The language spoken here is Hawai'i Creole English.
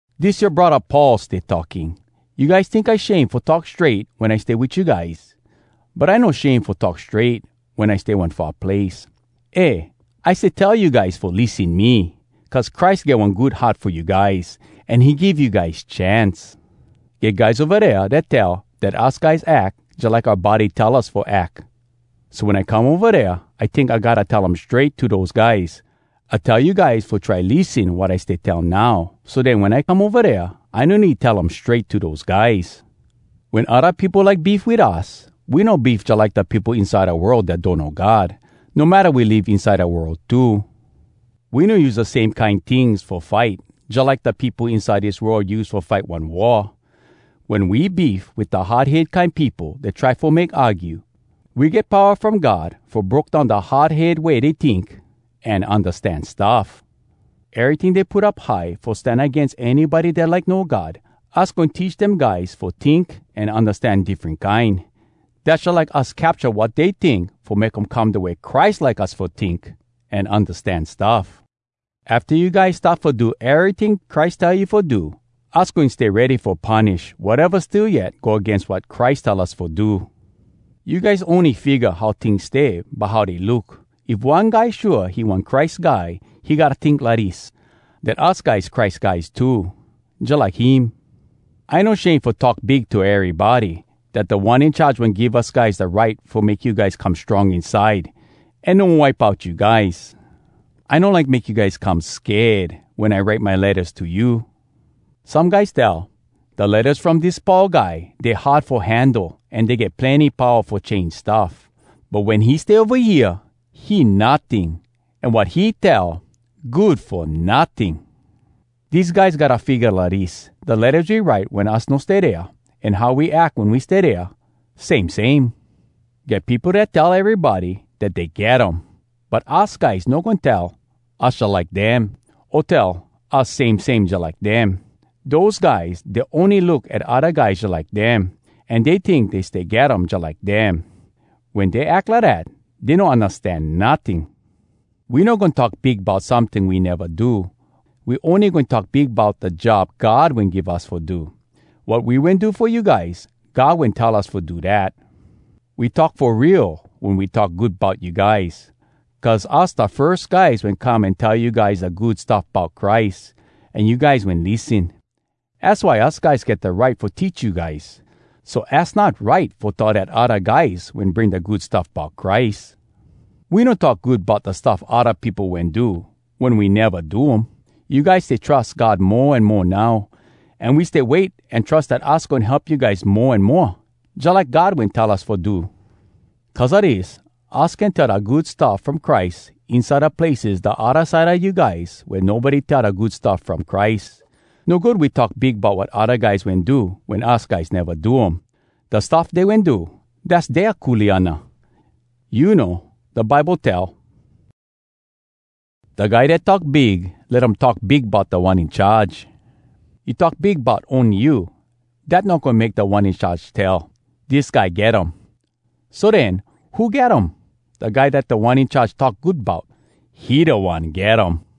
Dis yoa braddah Paul stay talking. You guys tink I shame fo talk strait wen I stay wit you guys? But I no shame fo talk strait wen I stay one far place. Eh, I stay tell you guys fo lissen me, cuz Christ get one good heart fo you guys, an he give you guys chance. Get guys ova dea dat tell dat us guys ack jalike oua body tell us fo ack. So wen I come ova dea, I tink I gotta tell um strait to dose guys. I tell you guys fo try lissen wat I stay tell now, so den wen I come ova dea, I no need tell um strait to dose guys. Wen odda peopo like beef wit us, we no beef jalike da peopo inside da world dat donno God, no matta we live inside da world too. We no use da same kine tings fo fight, jalike da peopo inside dis world use fo fight one war. Wen we beef wit da hard head kine peopo dat try fo make argue, we get powa from God fo broke down da hard head way dey tink an undastan stuff. Eryting dey put up high fo stan agains anybody dat like know God, us goin teach dem guys fo tink an undastan diffren kine. Dass jalike us capcha wat dey tink fo make um come da way Christ like us fo tink an undastan stuff. Afta you guys start fo do eryting Christ tell you fo do, us goin stay ready fo punish wateva still yet go agains wat Christ tell us fo do. You guys ony figga how tings stay by how dey look. If one guy shua he one Christ Guy, he gotta tink lidis, dat us guys Christ guys too, jalike him. I no shame fo talk big to erybody dat Da One In Charge wen give us guys da right fo make you guys come strong inside, an no wipe out you guys. I no like make you guys come sked wen I write my lettas to you. Some guys tell, “Da lettas from dis Paul guy, dey hard fo handle an dey get plenny powa fo change stuff. But wen he stay ova hea, he notting, an wat he tell, good fo notting.” Dese guys gotta figga lidis: Da lettas we write wen us no stay dea, an how we ack wen we stay dea, same same. Get peopo dat tell erybody dat dey get um. But us guys no goin tell us jalike dem, o tell us same same jalike dem. Dose guys, dey ony look at odda guys jalike dem, an dey tink dey stay get um jalike dem. Wen dey ack lidat, dey no undastan notting. We no goin talk big bout someting we neva do. We ony goin talk big bout da job God wen give us fo do. Wat we wen do fo you guys, God wen tell us fo do dat. We talk fo real wen we talk good bout you guys. Cuz us da firs guys wen come an tell you guys da Good Stuff Bout Christ, an you guys wen lissen. Az why us guys get da right fo teach you guys. So az not right fo tell dat odda guys wen bring da Good Stuff Bout Christ. We no talk good bout da stuff odda peopo wen do wen we neva do um. You guys stay trus God mo an mo now, an we stay wait an trus dat us goin help you guys mo an moa, jalike God wen tell us fo do. Cuz a dis, us can tell da Good Stuff From Christ inside da places da odda side a you guys wea nobody tell da Good Stuff From Christ. No good we talk big bout wat odda guys wen do wen us guys neva do um. Da stuff dey wen do, dass dea kuleana. You know, da Bible tell, “Da guy dat talk big, let um talk big bout Da One In Charge.” You talk big bout ony you, dat no goin make Da One In Charge tell, “Dis guy get um.” So den, who get um? Da guy Da One In Charge talk good bout, he da one get um!